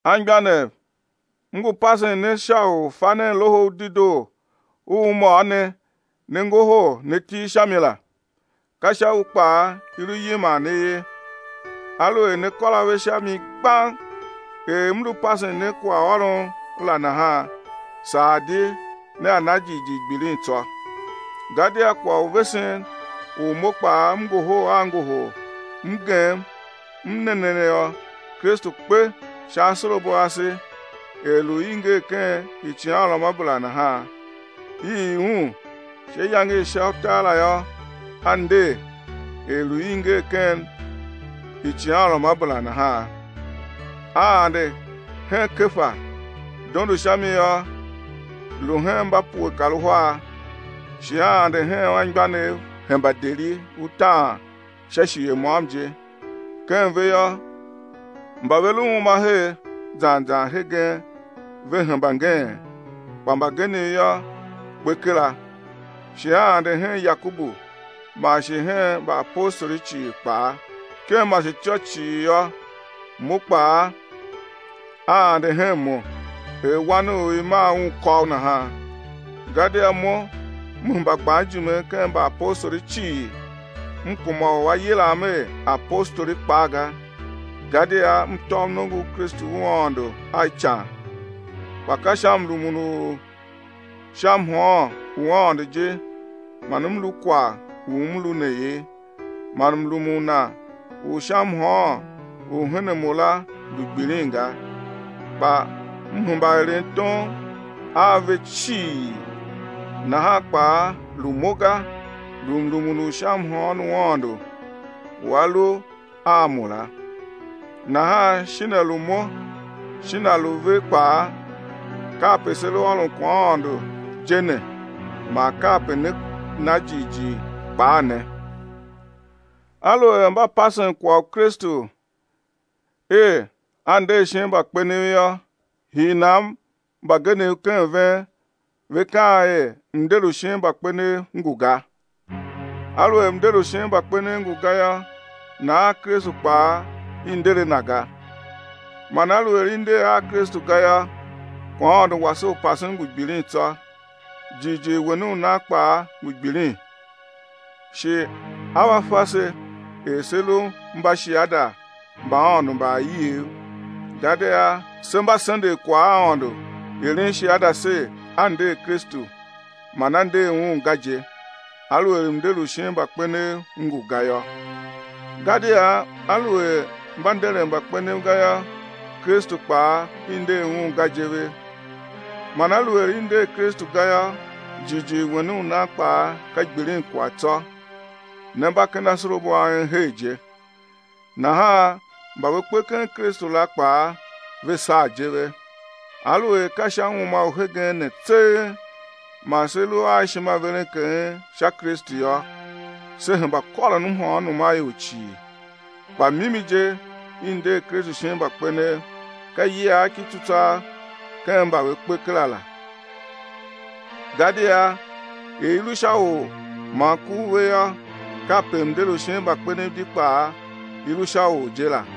Anmgbianev, m ngu pasen ne sha u fa nen Loho u Dedoo u m ôr ne, ne ngohol ne til sha mi la. Ka sha u kpaa i lu yiman ne ye, aluer ne kôr ave sha mi gbang er m lu pasen ne kwaghôron la nahan, saa di nea na jighjigh gbilin tsô. Gadia kwagh u vesen u mo kpaa m ngohol a ngohol m gem m ne ne yô: Kristu kpe sha asorabo ase er lu i nger ken icighanruamabera nahan. I ii Un, sha iyange i sha utar la yô, A nder er lu i nger ken icighanruamabera nahan. A ande hen Kefa, dondo sha mi yô, lu hen mba pue kar uhar. Shi A ande hen anmgbianev hemba deri utaan sha shighe môm je, ken ve yô, mba ve lu uma her zan zan hegen ve hemba ngeen, kpa mbagenev yô, kpe kera. Shi A ande hen Yakobu, man shi hen mbaapostoli cii kpaa. Ken masetyô cii yô, mo kpaa A ande hen mo er wan u i mar un kôgh nahan. Gadia mo m hemba gban ijime ken mbaapostoli cii m kuma u á yilam er apostoli kpaa ga, gadia m tôv nongo u Kristu u Aôndo a ican. Kpa ka sha mrumun u sha mhôôn u Aôndo je man m lu kwagh u m lu ne ye, man mrumun Na u sha mhôôn u hen a mo la lu gbilin ga, kpa m hemba eren tom a ve cii, nahan kpaa lu mo ga, lu mrumun u sha mhôôn u Aôndo u a lu a mo la. Nahan shin a lu mo, shin a lu ve kpaa, kape se lu ôron kwaghaôndo je ne, man kape ne na jighjigh kpaa ne. Aluer mba pasen kwagh u Kristu er A nder shin mbakpenev yô, hii nan man mbagenev ken ven ve kaan er mnder u shin mbakpenev ngu ga? Aluer mnder u shin mbakpenev ngu ga yô, nahan Kristu kpaa, i nder a Na ga. Man aluer i nder a Kristu ga yô, kwaghaôndo wase u pasen ngu gbilin tsô, jighjigh wen u nan kpaa ngu gbilin. Shi á va fa se er se lu mbashiada mba Aôndo mba aiev, gadia se mba sendegh kwagh a Aôndo eren shiada ser, A nder Kristu, man A nder Un ga je, aluer mnder u shin mbakpenev ngu ga yô. Gadia aluer mba nderen mbakpenev ga yô, Kristu kpaa i nder Un ga je ve. Man aluer i nder Kristu ga yô, jighjigh wen u nan kpaa ka gbilinkwagh tsô, ne mba ken asorabo a en her je. Nahan mba ve kpe ken Kristu la kpaa ve saa je ve. Aluer ka sha uma u hegen ne tseegh man se lu a ishimaverenkeghen sha Kristu yô, se hemba kôron mhôônom a ior cii. Kpa mimi je i nder Kristu shin mbakpenev, ka iyiagh ki tsutswagh ken mba ve kpe kera la. Gadia er i lu sha or man ku u ve yô, kape mnder u shin mbakpenev di kpaa i lu sha or je la.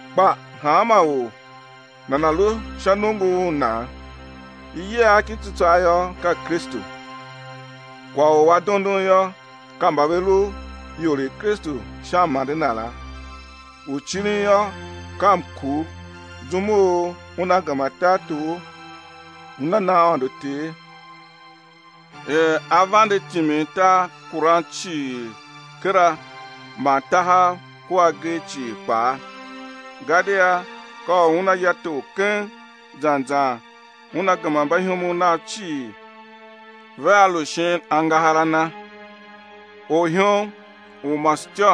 Kpa hanma or nana̱ lu sha nongo u nan. Iyiagh ki tsutswagh yô, ka Kristu; kwagh u a dondon yô, ka mba ve lu ior i Kristu sha m-ande Na la, u cirin yô, ka mkur zum u Una gema tartor Una na Aôndo Ter, er A vande timin tarkuran cii kera man tahav kua agee cii kpaa. Gadia ka u Una ya tor keng, zan zan Una gema mbaihomov Nav cii, vea lu shin angahar a Na. Orihom u masetyô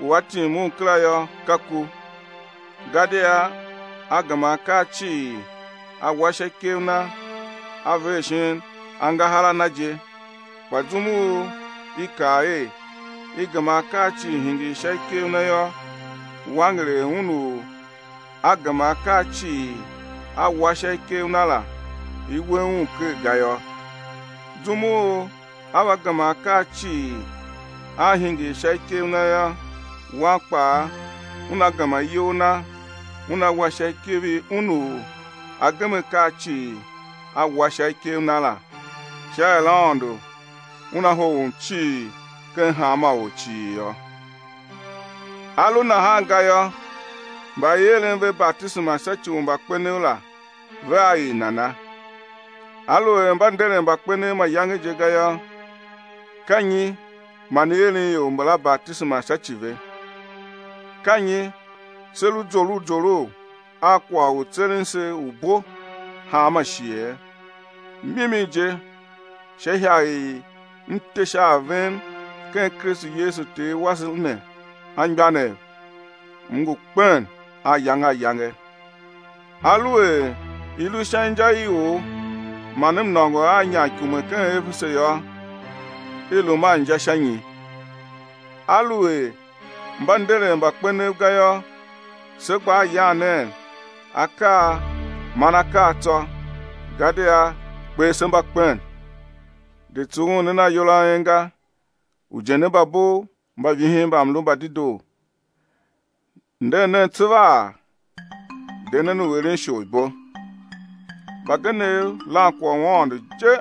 u á tim un kera yô, ka ku. Gadia A gema akaa cii A wa sha ikev Na A ver shin angahar a Na je, kpa zum u i kaa er: I gema akaa cii hingir sha ikev Na yô, wanger er Un u A gema akaa cii A wa sha ikev Na la i we Un ker ga yô. Zum u á va gema akaa cii á hingir sha ikev Na yô, Wan kpaa Una gema iyol Na Una wa sha ikev i Un u A gem akaa cii A wa sha ikev Na la, sha er Aôndo Una hoghom cii ken hanma or cii yô. A lu nahan ga yô, mba i eren ve batisema sha ci u mbakpenev la, vea er nana? Aluer mba nderen mbakpenev mayange je ga yô, ka nyi man i eren ior mbala batisema sha ci ve? Ka nyi se lu zorough zorough a kwagh u tseren se u bo hanma shighe? Mimi je, sha ihagh i m te sha a ven ken Kristu Yesu Ter wase ne, anmgbianev, m ngu kpen ayange ayange. Aluer i lu sha inja i or man m nôngo a inyamikume ken Efese yô, i lum a inja sha nyi? Aluer mba nderen mbakpenev ga yô, se gbaa yan nen akaa man akaa tsô, gadia kper se mba kpen. De tsughun nen ayol a en ga, ujende mba bov mba vihin mbamlu mba dedoo. Nder nen tsevaa, de nen u eren isholibo. Mbagenev lan kwagh u Aôndo je,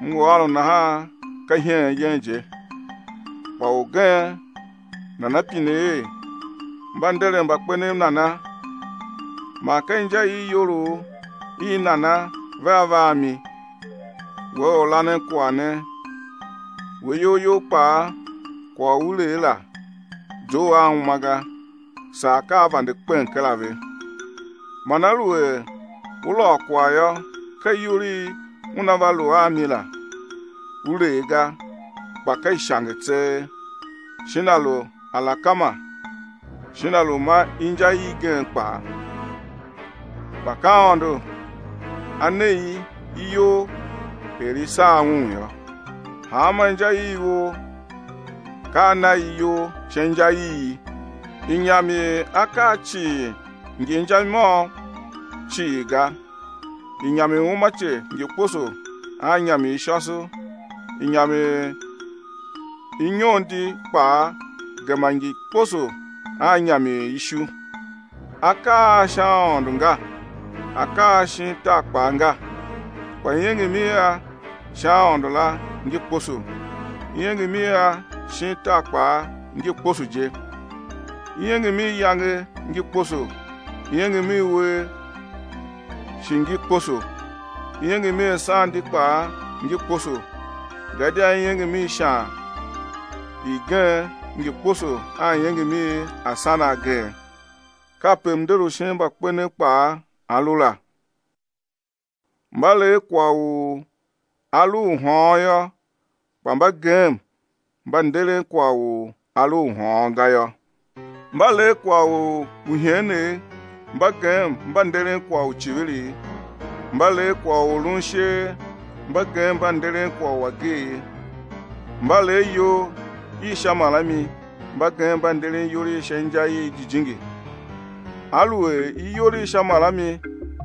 M ngu ôron nahan ka iheen yen je. Kpa orgen nana pine er: Mba nderen mbakpenev nana? Man ka inja i iyolough i nana vea va a mi? We orlanenkwagh ne! We iyol you kpaa, kwagh u u lee la, zough a uma ga, saa ka a vande kpen kera ve. Man aluer u lôô kwagh yô, ka iyol i una va lu a mi la, u lee ga, kpa ka ishange tseegh, shin a lu alakema shin a lu ma inja igen kpaa. Kpa ka Aôndo A ne i iyol er i sar Un yô, hanma inja i ivor ka A na i iyol sha inja i i. Inyam i akaa cii ngi inja i môm cii ga, inyam i uumace ngi kposo a inyam i shôso, inyam i inyon di kpaa gema ngi kposo a inyam i ishu. Akaa a sha aôndo nga, akaa a shin tar kpaa nga. Kpa iengem i a sha aôndo la ngi kposo, iengem i a shin tar kpaa ngi kposo je. Iengem i iyange ngi kposo, iengem i uwer shi ngi kposo, iengem i asan di kpaa ngi kposo, gadia iengem i ishan igen ngi kposo a iengem i asan agen. Kape mnder u shin mbakpenev kpaa, a lu la. Mba lee kwagh u a lu u hôôn yô, kpa mba gem mba nderen kwagh u a lu u hôôn ga yô. Mba lee kwagh u iheenegh mba gem mba nderen kwagh u icivirigh. Mba lee kwagh u lun isheer, mba gem mba nderen kwagh u ageegh. Mba lee iyol i sha marami, mba gem mba nderen iyol i sha inja i jijingi. Aluer iyol i sha marami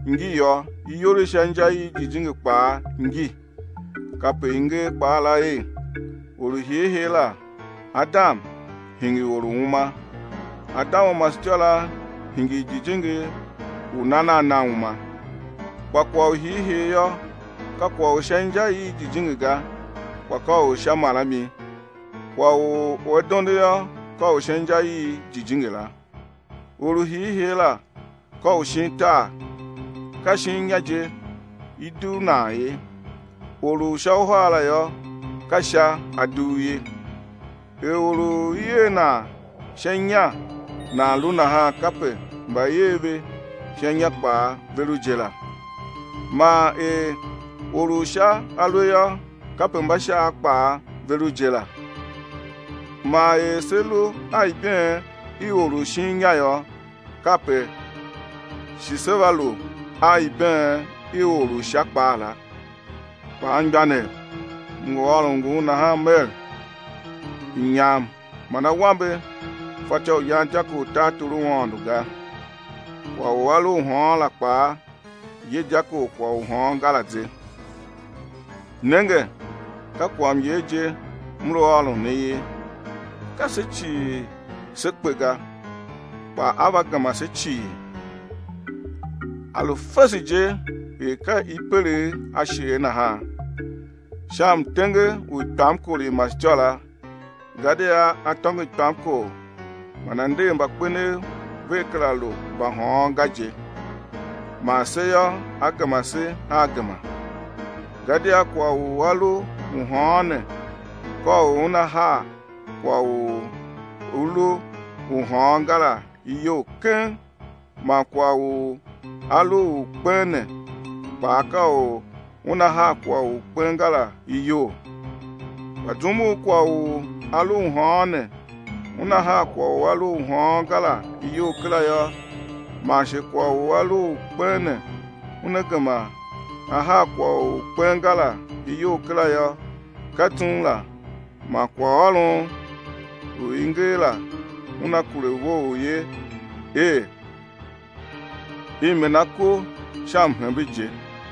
ngi yô, iyol i sha inja i jijingi kpaa ngi. Kape i nger kpaa la er: Or u hiihii la, Adam, hingir or u uma. Adam u masetyô la hingir jijingi u nan a na uma. Kpa kwagh u hiihii yô, ka kwagh u sha inja i jijingi ga kpa ka u sha marami, kwagh u a dondo yô, ka u sha inja i jijingi la. Or u hiihii la ka u shin tar, ka shin inya je i dugh nan ye, Or u sha uhar la yô, ka Sha A dugh ye. Er or u i er nan sha inya nan lu nahan, kape mba i er ve sha inya kpaa ve lu je la. Man er Or u Sha a lu yô, kape mbashaav kpaa ve lu je la. Man er se lu a ibeen i or u shin inya yô, kape shi se va lu a ibeen i Or u Sha kpaa la. Kpa, anmgbianev, m ngu ôron ngun nahan mer: inyam man awambe fatyô u yan dyako u tartor u Aôndo ga, kwagh u a lu u hôôn la kpaa, ye dyako u kwagh u hôôn ga la ze. Nenge, ka kwaghmyer je m lu ôron ne ye. Ka se cii sé kpe ga, kpa á va gema se cii. Á lu fese je er ka i pelegh ashee nahan, sha mtenge u ikpamkor i masetyô la, gadia á tôngo ikpamkor man á nder mbakpenev vea kera lu mbahôôn ga je, man se yô, á gema se a gema. Gadia kwagh u a lu u hôôn ne, ka u una haa kwagh u a lu u hôôn ga la iyol keng, man kwagh u a lu u kpen ne kpaa ka u una haa kwagh u kpen ga la iyol. Kpa zum u kwagh u a lu u hôôn ne una haa kwagh u a lu u hôôn ga la iyol kera yô, man shi kwagh u a lu u kpen ne una gema á haa kwagh u kpen ga la iyol kera yô, ka zum la man kwaghôron u i nger la una kure vough ye, er: I mena ku sha mhembe je.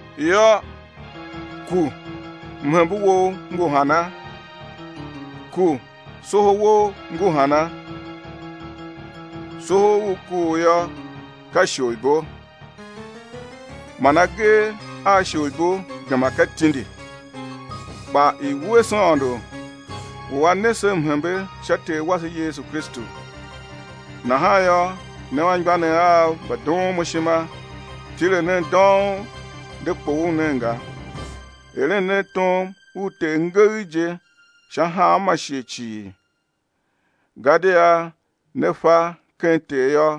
Yô, ku, mhembe wou ngu hana? Ku, soho wou ngu hana? Soho u kuugh yô, ka isholibo man agee a isholibo gema ka tindi. Kpa i̱ wuese Aôndo u A ne se mhembe sha Ter wase Yesu Kristu. Nahan yô, ne anmgbianev av mba doon mo ishima, tile nen dông, de kpoghol nen ga, eren nen tom u Ter ngegh je sha hanma shighe cii, gadia ne fa, ken Ter yô,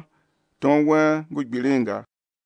tom wen ngu gbilin ga.